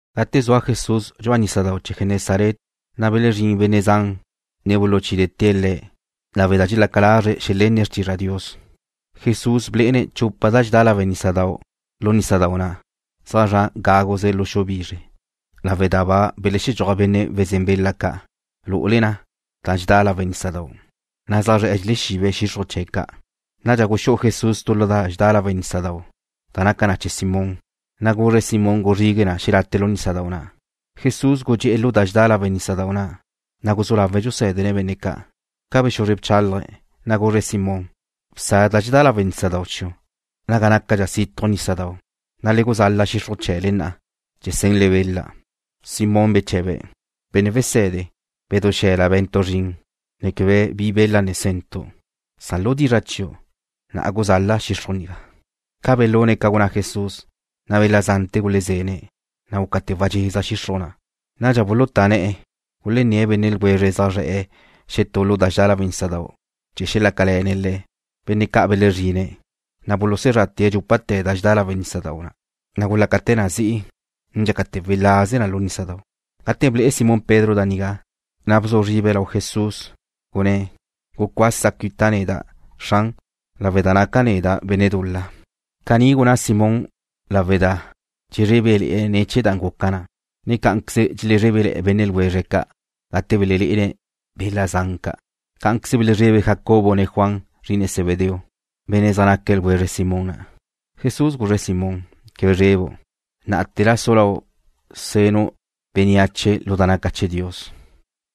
Gate zua Jesús dxu'a nísadau' chee̱ Genesaret, na' belezrín benne' zan, ne buluchídete̱' Le̱', lawe' da dxelaca lazre̱' xelenne̱' xrtizra' Dios. Jesús blé'ene̱' chupa da dxedá lawe' nísadau' lu nísadau' na', zaj zra' gáguze lu xu bizre, lawe' da ba belexedxúaj benne' wezén bela ca' lu'ule da dxedá lawe' nísadau', na' zaj zre̱'e̱ dxelexibe̱' xixruj chee̱' ca'. Nadxa guxú'u Jesús tu lu da dxedá lawe' nísadau', da naca na chee̱ Simón, na' guzre̱' Simón guzrigue̱' na xelate' lu nísadau' na'. Jesús gudxé'e̱ lu da dxedá lawe' nísadau' na', na' guzú lawe̱' dxusé̱dene̱' benne' ca'. Ca bexuzre bchálaje̱', na' guzre̱' Simón: ―Bsa da dxedá lawe' nísadau' chiu' naga nácadxa situj nísadau', na' le guzal-la xixruj chee̱le na' chee̱ senle bela. Simón beche̱be̱': ―Benne' Wese̱de, bedú xe̱la be̱ntu' zrin, ne quebe bi bela ne sentu'. Lu dizra' chiu', na'a guzal-la' xixruj nigá. Ca belune̱' ca gunná Jesús, na' bela zante̱ gulezene̱', na' gúcate̱ wadxeza xixruj na'. Nadxa bulutá ne̱'e̱ gulenné̱' benne' ljwezre̱' zaj zre̱'e̱ xetú lu da dxedá lawe' nísadau' chee̱ xelácale̱ne̱' le̱'. Benne' ca' belezrine̱', na' bulusezrate̱' dxúpate̱ da dxedá lawe' nísadau' ca', na' gulácate̱ na zi'i, ne dxácate̱ welaze na lu nísadau'. Gate ble'e Simón Pedro da nigá, na' bzu zribe̱' lau Jesús, gunné̱': ―Gucuasa cuita' neda', Xran, lawe' da naca' neda' benne' dul-la. Caní gunná Simón lawe' da dxezrébele̱'e̱ ne̱ chee̱ da guca na, ne cá'anqueze dxelezrebe benne' ljwezre̱' ca', gate belelé'ene̱' bela zan ca'. Cá'anqueze belezrebe Jacobo ne Juan, zri'ine Zebedeo, benne' zaj naque̱' ljwezre Simón na'. Jesús guzre̱' Simón: ―Quebe zrebu'. Ná'ate̱la su lau' senu' bénneache lu da naca chee̱ Dios.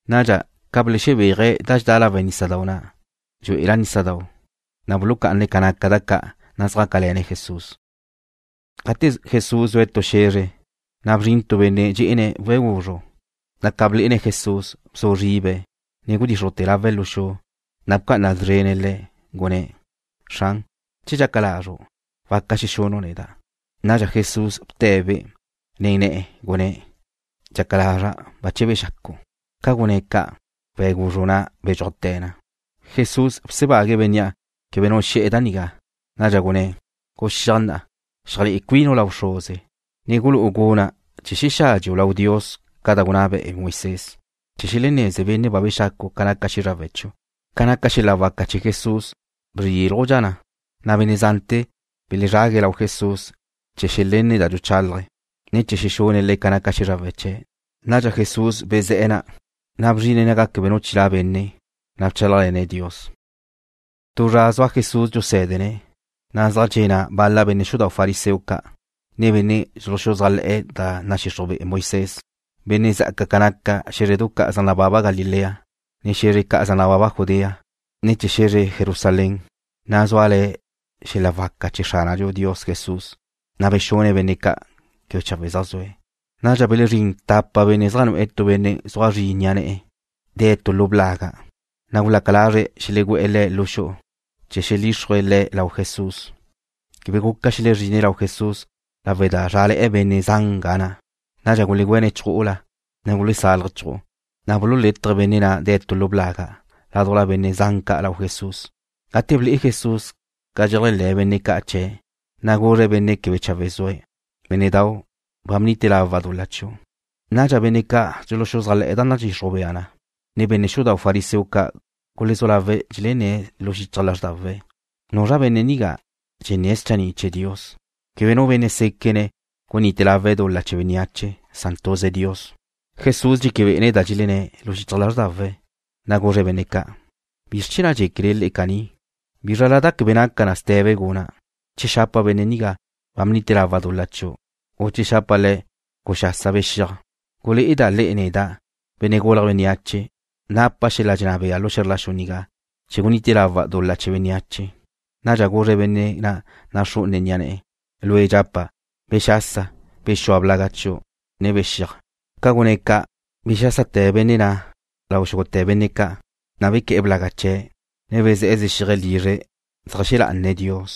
Nadxa, ca belexebéaje̱' da dxedá lawe' nísadau' na' dxú'ela nísadau', na' bulucá'ane̱' ca naca da ca', na' zjácale̱ne̱' Jesús. Gate Jesús zue̱' tu xe̱zre, na' bzrin tu benne' dxé'ene̱' we̱' guzru', na' ca blé'ene̱' Jesús, bzu zribe̱', ne gudíxrujte̱ lawe̱' lu xu, na' bca'ana szrene̱' Le̱', gunné̱': ―Xran, che dxaca lazru', waca xexunu' neda'. Nadxa Jesús bte̱'-be' nen ne̱'e̱, gunné̱': ―Dxaca lazra'. Bache bexacu'. Ca gunné̱' ca', we̱' guzru' na' bedxúajte̱ na. Jesús bsebague̱' bénnea' quebe nu xe̱'e̱ da nigá. Nadxa gunné̱': ―Guxíaj na'a, xeajlé'e cuinu' lau bxruze, ne gulú'u dumí chee̱ xexádxeu' lau Dios ca da gunná be'e Moisés chee̱ xeleneze benne' ba bexacu' ca naca xízrawe̱' chiu'. Ca naca xel-la waca chee̱ Jesús bzrílujdxa na, na' benne' zante̱ belezrague̱' lau Jesús chee̱ xelenne̱' da dxuchálaje̱', ne chee̱ xexune̱' le̱' ca naca xízrawe̱' chee̱'. Nadxa Jesús bezé̱'e̱ na', na' bzrine̱' naga quebe nu chilá' benne', na' bchálajle̱ne̱' Dios. Tu zra zua Jesús dxusé̱dene̱', na' bal-la benne' xudau' fariseo ca', ne benne' dxuluxuzájle̱'e̱ da nadxixruj be'e Moisés, zaj dxe'e̱ na', benne' zá'aque̱' ca naca xé̱zredu ca' zaj nababa Galilea, ne xe̱zre ca' zaj nababa Judea, ne chee̱ xe̱zre Jerusalén, na' zúale̱ xel-la waca chee̱ Xránadxu Dios Jesús, na' bexune̱' benne' ca' quebe chawe' zaj zue̱'. Nadxa belezrín tapa benne' zaj nu'e̱ tu benne' zua zri ni'a ne̱'e̱, dee̱' tu lu blaga', na' gulaca lazre̱' xelegú'e̱ le̱' lu xu'u chee̱ xelíxrue̱' le̱' lau Jesús. Quebe guca xelezrine̱' lau Jesús lawe' da zrále̱'e̱ benne' zan ga na'. Nadxa gulegüéne̱' chju'ula, ne gulesaluje̱' chju'u, na' bululétaje̱' benne' na' de̱' lu blaga' ládujla benne' zan ca' lau Jesús. Gate ble'e Jesús ca dxeléajle̱ benne' ca' chee̱', na' guzre̱' benne' quebe chawe' zue̱': ―Bénne'dau', ba bnite lawa' dul-la chiu'. Nadxa benne' ca' dxuluxuzájle̱'e̱ da nadxixruj bea na, ne benne' xudau' fariseo ca' gulezú lawe̱' dxelenné̱' lu xichaj lázrdawe̱': ¿Nuzra benne' nigá, dxenné̱' schanni' chee̱ Dios? Quebe nu benne' séquene̱' gunite lawe̱' dul-la chee̱ bénneache. Tuze Dios gaque̱'. Jesús dxéquebe'ene̱' da dxelenné̱' lu xichaj lázrdawe̱', na' guzre̱' benne' ca': ―¿Bizr chee̱ na' dxéquele le'e caní? ¿Bízrala na quebe naca na ste̱be guna', che xapa' benne' nigá: Ba bnite lawa' dul-la chiu', u che xapa' le̱': Guxasa bexíaj? Gulé'eda' le'e neda', Benne' Gulje̱' Bénneache, napa' xel-la dxenná bea lu xe̱zr la xu nigá chee̱ gunite lawa' dul-la chee̱ bénneache. Nadxa guzre̱' benne' na' naxrú'une ni'a ne̱'e̱: ―Lue' dxapa', bexasa, bexúa blaga' chiu', ne bexíaj. Ca gunné̱' ca', bexásate̱ benne' na' lau xúgute̱ benne' ca', na' bequé̱'e̱ blaga' chee̱', ne bezé̱'e̱ zexíaje̱' lizre̱' zeajxé̱ lá'ane̱' Dios.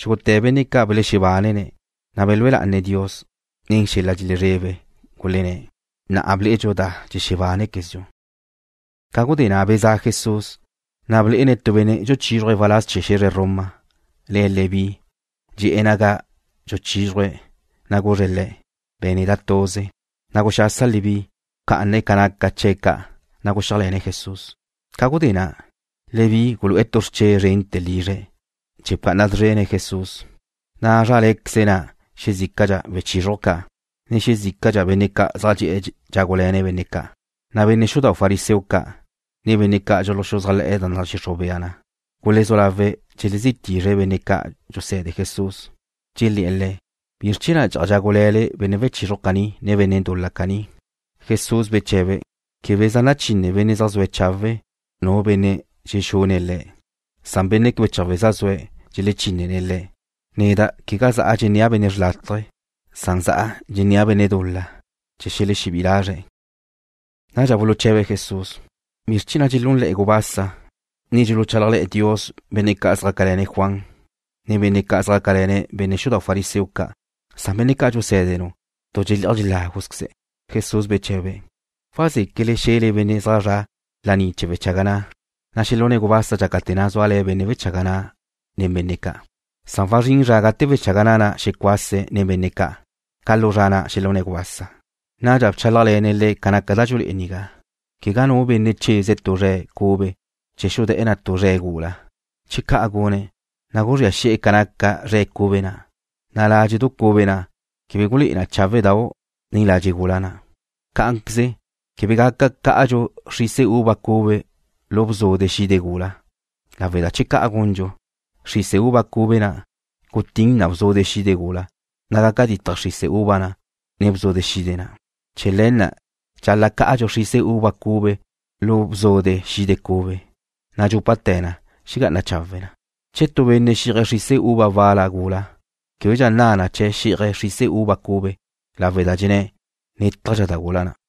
Xúgute̱ benne' ca' belexebánene̱', na' belúe lá'ane̱' Dios, ne nen xel-la dxelezrebe gulenné̱': ―Na'a ble'edxu da dxebánequezdxu. Ca gudé na' bezá'a Jesús, na' blé'ene̱' tu benne' dxuchizruje̱' waláz chee̱ xe̱zre Roma, le̱' Leví. Dxe'e̱ naga dxuchízruje̱', na' guzre̱' le̱': ―Be̱n neda' tuze. Na' guxasa Leví, bca'ane̱' ca naca chee̱' ca', na' guxíajle̱ne̱' Jesús. Ca gudé na', Leví gulu'e̱ tu xrche' zrente̱ lizre̱' chee̱ bca'ana szrene̱' Jesús, na' zrále̱'e̱queze na' xezícadxa wechizruj ca', ne xezícadxa benne' zaj dxe'e̱ dxágule̱ne̱' benne' ca'. Na' benne' xudau' fariseo ca', ne benne' ca' dxuluxuzájle̱'e̱ da nadxixruj bea na gulezú lawe̱' dxelezí tizre̱' benne' ca' dxuse̱de Jesús, dxelé̱'e̱ le̱': ―¿Bizr chee̱ na' dxe'aj dxágule̱le benne' wechizruj caní, ne benne' dul-la ca'? Jesús beche̱be̱': ―Quebe zaj nachine benne' zaj zua chawe' nu benne' dxexúne̱' le̱'. Benne' quebe chawe' zaj zue̱' dxelechínene̱' le̱'. Neda' quegá za'a dxennéa' benne' xrlátaje. Za'a dxennéa' benne' dul-la, chee̱ xelexebí'i lazre̱'. Nadxa buluche̱be̱' Jesús: ―¿Bizr chee̱ na' dxelúnle̱'e̱ gubasa, ne dxuluchálajle̱ Dios benne' ca' zjácale̱ne̱' Juan, ne benne' ca' zjácale̱ne̱' benne' xudau' fariseo ca', san benne' ca' dxusé̱denu' tu dxelé'aj dxeláguzqueze̱'? Jesús beche̱be̱': ―¿Wazéquele xe̱le benne' zaj zra' laní chee̱ wechaga na' xelune̱' gubasa dxácate̱ na' zua benne' wechaga na' nen benne' ca'? Wazrín zra gate wechaga na' na' xecuase̱' nen benne' ca'. Ca lu zra na' xelune̱' gubasa. Nadxa bchálajle̱ne̱' le̱' ca naca da dxulé'e nigá: ―Quegá nu benne' cheze̱' tu zre̱' cube chee̱ xudé̱'e̱ na tu zre̱' gula. Che ca' gune̱', na' guzría xi'e̱ ca naca zre̱' cube na', na' ládxe'du cube na' quebe gulé'e na cháwedau' nen ladxe' gula na'. Cá'anqueze quebe gaca cá'adxu xrise uva cube lu bzude xide gula, lawe' da che ca' gundxu, xrise uva cube na' gutín na bzude xide gula, na' gaca ditje xrise uva na', ne bzude xide na'. Chee̱ le̱ na' dxal-la' cá'adxu xrise uva cube lu bzude xide cube, na' dxúpate̱ na' xegá'ana chawe' na. Che tu benne' xí'aje̱' xrise uva wal-la gula, québedxa nna na chee̱' xí'aje̱' xrise uva cube, lawe' da dxenné̱': “Nétajdxa da gula na'.”